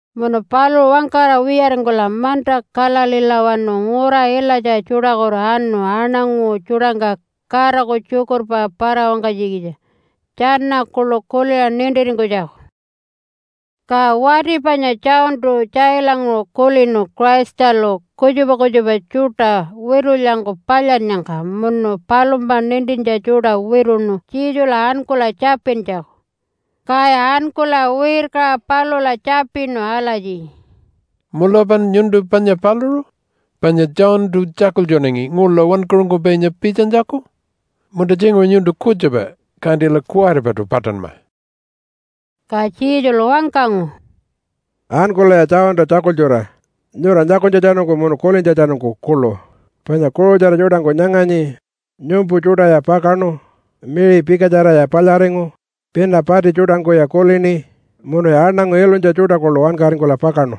Munu paluṟu wangkara wiyaringkula manta Galileelawanu ngura ilatja tjuṯakutu anu aṉangu tjuṯangka Godaku tjukurpa para-wangkanytjikitja tjana kuḻu kuliṟa nintiringkunytjaku. Ka wati panya Johntu tjailanguṟu kulinu Christalu kutjupa kutjupa tjuṯa witulyangku palyannyangka munu palumpa nintintja tjuṯa wituṉu Jesula ankula tjapintjaku. Kaya ankula wirkaṟa palula tjapinu alatji, “Mulapan nyuntu panya paluṟu, panya Johntu tjakultjunangi ngula wankaṟunkupainya pitjanytjaku? Munta tjinguṟu nyuntu kutjupa, kantila kuwaripaṯu paṯanma.” Ka Jesulu wangkangu, “Ankulaya Johnta tjakultjura nyura nyakunytjatjanungku munu kulintjatjanungku kuḻu, panya kuṟutjara tjuṯangku nyanganyi, nyumpu tjuṯaya pakaṉu, miṟi pikatjaraya palyaringu, pina pati tjuṯangkuya kulini, munuya aṉangu ilunytja tjuṯa kuḻu wankaringkula pakaṉu.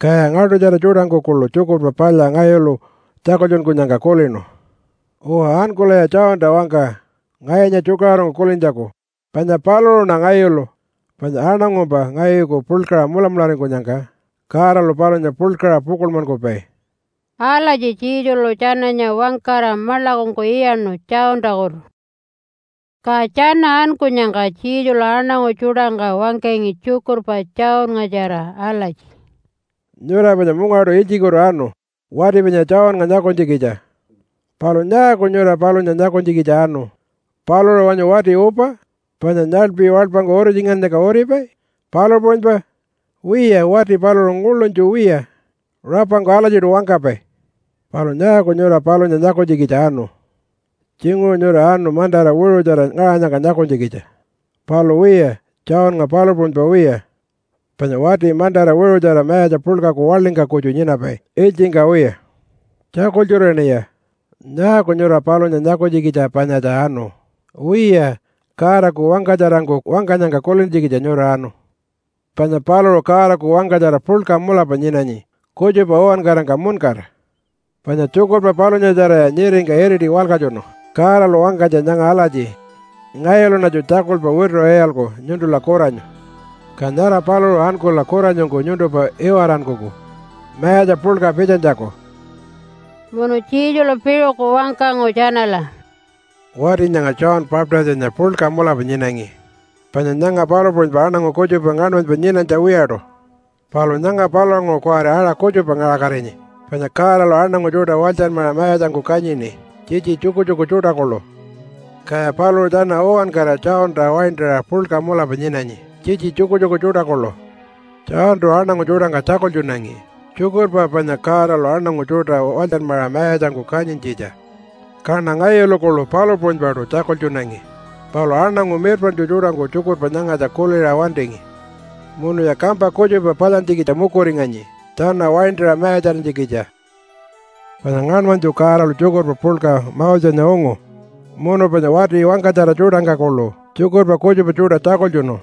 Kaya ngaḻṯutjara tjuṯangku kuḻu Tjukurpa Palya ngayulu tjakultjunkunyangka kulinu. Uwa, ankulaya Johnta wangka ngayunya tjukaṟurungku kulintjaku, panya paluṟuṉa ngayulu. Panya aṉangumpa ngayuku puḻkaṟa mulamularingkunyangka Godalu palunya puḻkaṟa pukuḻmankupai.” Alatji Jesulu tjananya wangkara maḻakungku iyaṉu Johntakutu. Ka tjana ankunyangka Jesulu aṉangu tjuṯangka wangkangi tjukurpa Johnngatjara alatji, “Nyura panya mungaṯu ilytjikutu anu wati panya Johnnga nyakunytjikitja. Palu nyaaku nyura palunya nyakunytjikitja anu? Paluṟu wanyu wati upa, panya nyaḻpi waḻpangku uritjingannyangka uripai, palu puṟunypa? Wiya, wati paluṟu nguḻunytju wiya rapangku alatjiṯu wangkapai. Palu nyaaku nyura palunya nyakunytjikitja anu? Tjinguṟu nyura anu mantara wiṟutjara ngaṟanyangka nyakunytjikitja. Palu wiya, Johnnga palu puṟunypa wiya, panya wati mantara wiṟutjara mayatja puḻkaku waḻingka kutju nyinapai ilytjingka wiya. Tjakultjuraṉiya! Nyaaku nyura palunya nyakunytjikitja panyatja anu? Wiya, Godaku wangkatjarangku wangkanyangka kulintjikitja nyura anu, panya paluṟu Godaku wangkatjara puḻka mulapa nyinanyi kutjupa uwankarangka muṉkara. Panya tjukurpa palunyatjaraya nyiringka iriti walkatjunu Godalu wangkanytja nyanga alatji, ‘Ngayuluṉatju tjakulpa wituṟa iyalku nyuntula kuranyu. Ka nyara paluṟu ankula kuranyungku nyuntumpa iwarankuku mayatja puḻka pitjanytjaku.’” Munu Jesulu piṟuku wangkangu tjanala, “Wati nyanga John Baptistanya puḻka mulapa nyinangi, panya nyanga palu puṟunypa aṉangu kutjupa ngaṉmanypa nyinanytja wiyaṯu. Palu nyanga palulanguṟu kuwari aṟa kutjupa ngaṟakatinyi panya Godalu aṉangu tjuṯa walytjanmaṟa mayatjangku kanyini tjitji tjukutjuku tjuṯa kuḻu, kaya paluṟu tjana uwankara Johnta waintaṟa puḻka mulapa nyinanyi tjitji tjukutjuku tjuṯa kuḻu. Johntu aṉangu tjuṯangka tjakultjunangi tjukurpa panya Godalu aṉangu tjuṯa walytjanmaṟa mayatjangku kanyintjitja, kaṉa ngayulu kuḻu palu puṟunypaṯu tjakultjunangi. Palu aṉangu mirpaṉtju tjuṯangku tjukurpa nyangatja kuliṟa wantingi munuya kampa kutjupa palyantjikitja mukuringanyi tjana waintaṟa mayatjarinytjikitja. “Panya ngaṉmanytju Godalu tjukurpa puḻka Mosenya ungu munu panya wati wangkatjara tjuṯangka kuḻu tjukurpa kutjupa tjuṯa tjakultjunu,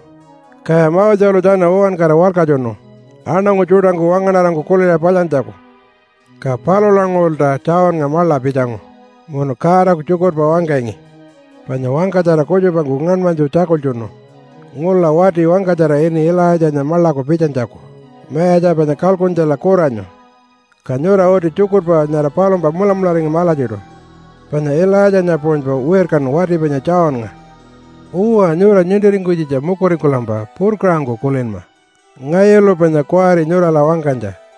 kaya Moselu tjana uwankara walkatjunu aṉangu tjuṯangku wangaṉarangku kuliṟa palyantjaku. Ka palulanguṟulta Johnnga maḻa pitjangu munu Godaku tjukurpa wangkangi. Panya wangkatjara kutjupangku ngaṉmanytju tjakultjunu ngula wati wangkatjara ini Ilaitjanya maḻaku pitjanytjaku Mayatja panya kalkuntjala kuranyu. Ka nyura uti tjukurpa nyara palumpa mulamularingama alatjiṯu, panya Ilaitjanya puṟunypa wirkanu wati panya Johnnga. Uwa, nyura nintiringkunytjikitja mukuringkulampa purkaṟangku kulinma ngayulu panya kuwari nyurala wangkanytja.”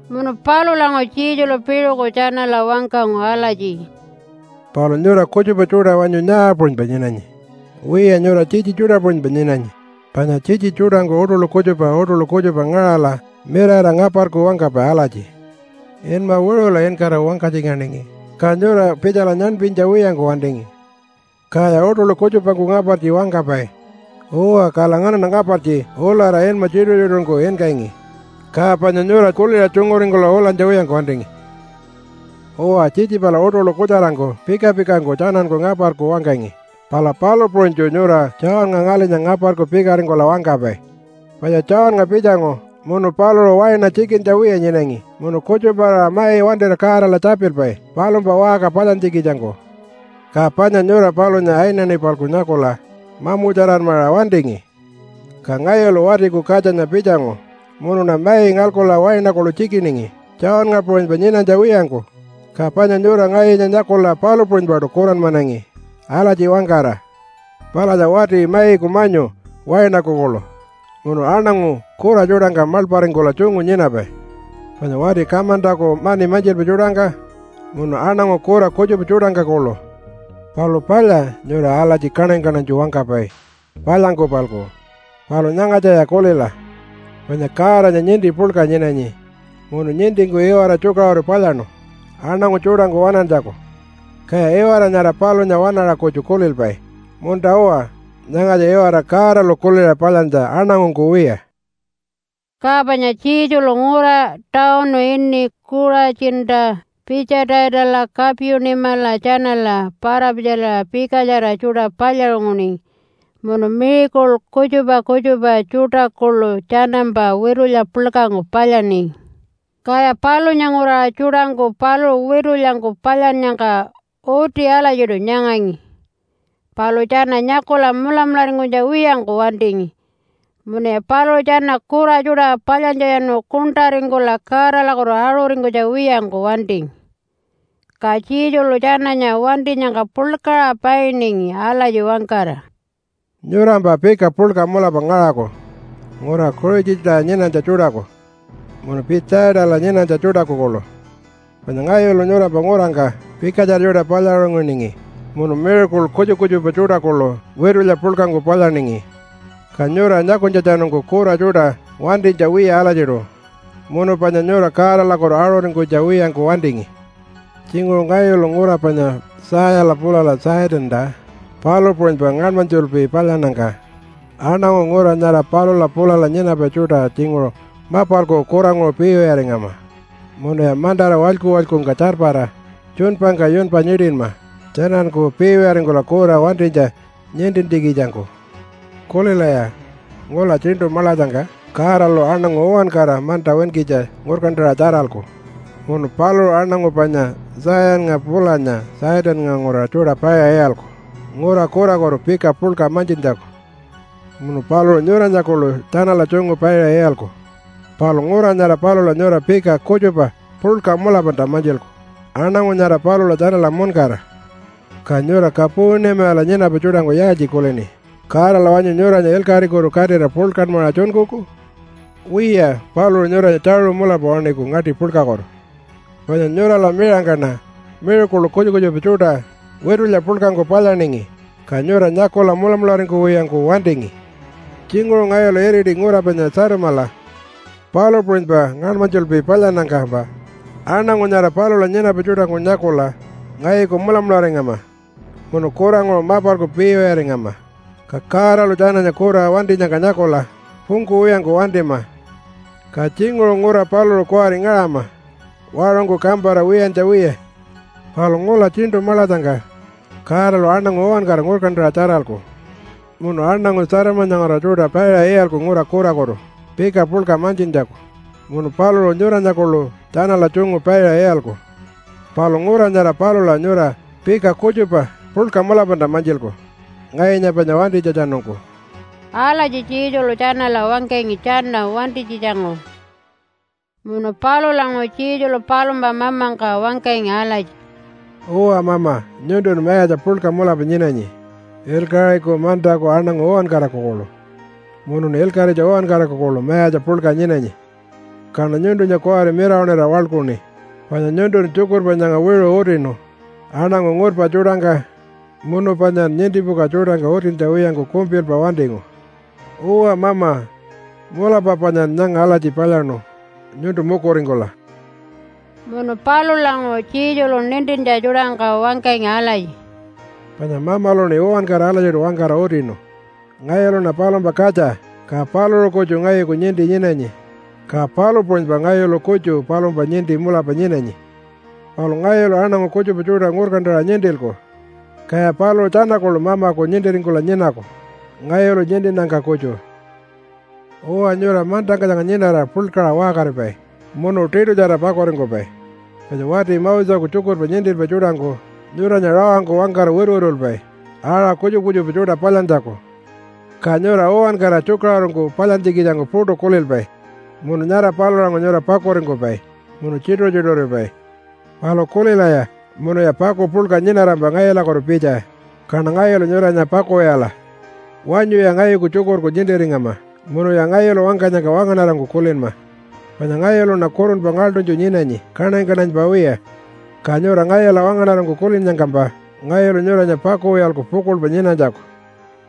Munu palulanguṟu Jesulu piṟuku tjanala wangkangu alatji, “Palu nyura kutjupa tjuṯa wanyu nyaa puṟunypa nyinanyi? Wiya, nyura tjitji tjuṯa puṟunypa nyinanyi, panya tjitji tjuṯangku uṯuḻu kutjupa uṯuḻu kutjupa ngaṟala mirara ngaparku wangkapai alatji, ‘Inma wiṟula inkara wangkatjinganingi, ka nyura pitjala nyaṉpinytja wiyangku wantingi.’ Kaya uṯuḻu kutjupangku ngapartji wangkapai, ‘Uwa, kala nganaṉa ngapartji ulara inma tjituṟu-tjituṟungku inkangi, ka panya nyura kuliṟa tjunguringkula ulanytja wiyangku wantingi.’ Uwa, tjitji pala uṯuḻu kutjarangku pika-pikangku tjananku ngaparku wangkangi, pala palu puṟunytju nyura Johnnga ngalinya ngaparku pikaringkula wangkapai. Panya Johnnga pitjangu munu paluṟu waina tjikintja wiya nyinangi munu kutjupa-aṟa mai wantira Godala tjapilpai palumpa waṟka palyantjikitjangku. Ka panya nyura palunya ayinayini-palku nyakula mamutjaranmaṟa wantingi. Ka ngayulu Watiku Katjanya pitjangu munuṉa mai ngalkula waina kuḻu tjikiningi Johnnga puṟunypa nyinanytja wiyangku, ka panya nyura ngayunya nyakula palu puṟunypaṯu kuranmanangi alatji wangkara, ‘Palatja wati maiku manyu wainaku kuḻu, munu aṉangu kura tjuṯangka maḻparingkula tjungu nyinapai, panya wati kamantaku mani mantjilpai tjuṯangka munu aṉangu kura kutjupa tjuṯangka kuḻu.’ Palu palya nyura alatji kaṉany-kaṉanytju wangkapai palyangku-palku. Palu nyangatjaya kulila, panya Godanya ninti puḻka nyinanyi munu nintingku iwara tjukaṟuru palyaṉu aṉangu tjuṯangku waṉantjaku, kaya iwara nyara palunya waṉaṟa kutju kulilpai, ‘Munta-uwa, nyangatja iwara Godalu kuliṟa palyantja aṉangungku wiya.’” Ka panya Jesulu ngura tawunu ini Kuṟatjinta, Pitjaitala, Kapunimala tjanala para-pitjaliṟa pikatjara tjuṯa palyaṟunguningi munu miracle kutjupa kutjupa tjuṯa kuḻu tjanampa witulya puḻkangku palyaningi. Kaya palunya nguraṟa tjuṯangku paluṟu witulyangku palyannyangka uti alatjiṯu nyangangi, palu tjana nyakula mulamularingkunytja wiyangku wantingi munuya paluṟu tjana kura tjuṯa palyantjatjanu kuṉṯaringkula Godalakutu aṟuringkunytja wiyangku wantingi. Ka Jesulu tjananya wantinyangka puḻkaṟa painingi alatji wangkara, “Nyurampa pika puḻka mulapa ngaṟaku ngura Kuṟatjinta nyinanytja tjuṯaku munu Pitjaitala nyinanytja tjuṯaku kuḻu, panya ngayulu nyurampa ngurangka pikatjara tjuṯa palyaṟunguningi munu miracle kutjupa kutjupa tjuṯa kuḻu witulya puḻkangku palyaningi, ka nyura nyakunytjatjanungku kura tjuṯa wantinytja wiya alatjiṯu munu panya nyura Godalakutu aṟuringkunytja wiyangku wantingi. Tjinguṟu ngayulu ngura panya Tayala pulala Tjaitanta palu puṟunypa ngaṉmanytjulpi palyannyangka aṉangu ngura nyara palula pulala nyinapai tjuṯa tjinguṟu mapalku kuranguṟu piiwiyaringama munuya mantara walyku-walykungka tjarpara tjuṉpangka yunpa nyiṯinma tjananku piiwiyaringkula kura wantinytja nintintjikitjangku. Kulilaya! Ngula tjiṉṯu maḻatjangka Godalu aṉangu uwankara manta winkitja ngurkantaṟa tjaralku, munu paluṟu aṉangu panya Tayanya pulanya Tjaitannga nguraṟa tjuṯa paiṟa iyalku ngura kurakutu pika puḻka mantjintjaku. Munu paluṟu nyuranya kuḻu tjanala tjungu paiṟa iyalku, palu ngura nyara palula nyura pika kutjupa puḻka mulapalta mantjilku aṉangu nyara palula tjanala muṉkara. Ka nyura Kapunimala nyinapai tjuṯangku yaaltji kulini? Godalu wanyu nyuranya ilkaṟikutu katira puḻkanmaṟa tjunkuku? Wiya, paluṟu nyuranya tjaṟu mulapa waṉiku ngaṯi puḻkakutu. Panya nyurala miṟangkaṉa miracle kutjupa kutjupa tjuṯa witulya puḻkangku palyaningi, ka nyura nyakula mulamularingkuwiyangku wantingi. Tjinguṟu ngayulu iriti ngura panya Tjatamala palu puṟunypa ngaṉmanytjulpi palyannyangkampa aṉangu nyara palula nyinapai tjuṯangku nyakula ngayuku mulamularingama munu kuranguṟu mapalku piiwiyaringama, ka Godalu tjananya kura wantinyangka nyakula pungkuwiyangku wantima, ka tjinguṟu ngura paluṟu kuwari ngaṟama waṟungku kampara wiyantja wiya. Palu ngula tjiṉṯu maḻatjangka Godalu aṉangu uwankara ngurkantaṟa tjaralku munu aṉangu Tjatamanya nguraṟa tjuṯa paiṟa iyalku ngura kurakutu pika puḻka mantjintjaku. Munu paluṟu nyuranya kuḻu tjanala tjungu paiṟa iyalku, palu ngura nyara palula nyura pika kutjupa puḻka mulapalta mantjilku ngayunya panya wantinytjatjanungku.” Alatji Jesulu tjanala wangkangi tjana wantinytjitjanguṟu. Munu palulanguṟu Jesulu palumpa mamangka wangkangi alatji, “Uwa Mama, nyuntun mayatja puḻka mulapa nyinanyi ilkaṟiku mantaku aṉangu uwankaraku kuḻu, munun ilkaṟitja uwankaraku kuḻu mayatja puḻka nyinanyi. Kaṉa nyuntunya kuwari mirawaṉira waḻkuṉi, panya nyuntun tjukurpa nyanga wiṟu utinu aṉangu ngurpa tjuṯangka munu panyan nintipuka tjuṯangka utintja wiyangku kumpilpa wantingu. Uwa Mama, mulapa panyan nyanga alatji palyaṉu nyuntu mukuringkula.” Munu palulanguṟu Jesulu nintintja tjuṯangka wangkangi alatji, “Panya Mamaluṉi uwankara alatjiṯu wangkara utinu. Ngayuluṉa palumpa katja ka paluṟu kutju ngayuku ninti nyinanyi, ka palu puṟunypa ngayulu kutju palumpa ninti mulapa nyinanyi. Palu ngayulu aṉangu kutjupa tjuṯa ngurkantaṟa nintilku, kaya paluṟu tjana kuḻu Mamaku nintiringkula nyinaku ngayulu nintinnyangka kutju. “Uwa, nyura mantangka nyanga nyinara puḻkaṟa waṟkaripai munu tiṯutjara pakuringkupai, panya wati Moseku tjukurpa nintilpai tjuṯangku nyuranya rawangku wangkara wituwitulpai aṟa kutjupa kutjupa tjuṯa palyantjaku, ka nyura uwankara tjukaṟurungku palyantjikitjangku puṯu kulilpai munu nyara palulanguṟu nyura pakuringkupai munu tjituṟu-tjituṟuripai. Palu kulilaya, munuya paku puḻka nyinarampa ngayulakutu pitja kaṉa ngayulu nyuranya pakuwiyala. Wanyuya ngayuku tjukurku nintiringama munuya ngayulu wangkanyangka wangaṉarangku kulinma, panya ngayuluṉa kurunpa ngaḻṯunytju nyinanyi kaṉany-kaṉanypa wiya, ka nyura ngayula wangaṉarangku kulinnyangkampa ngayulu nyuranya pakuwiyalku pukuḻpa nyinanytjaku.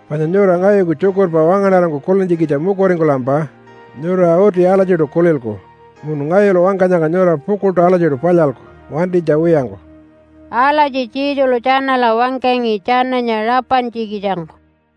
Panya nyura ngayuku tjukurpa wangaṉarangku kulintjikitja mukuringkulampa nyura uti alatjiṯu kulilku, munu ngayulu wangkanyangka nyura pukuḻṯu alatjiṯu palyalku wantinytja wiyangku.” Alatji Jesulu tjanala wangkangi tjananya rapantjikitjangku.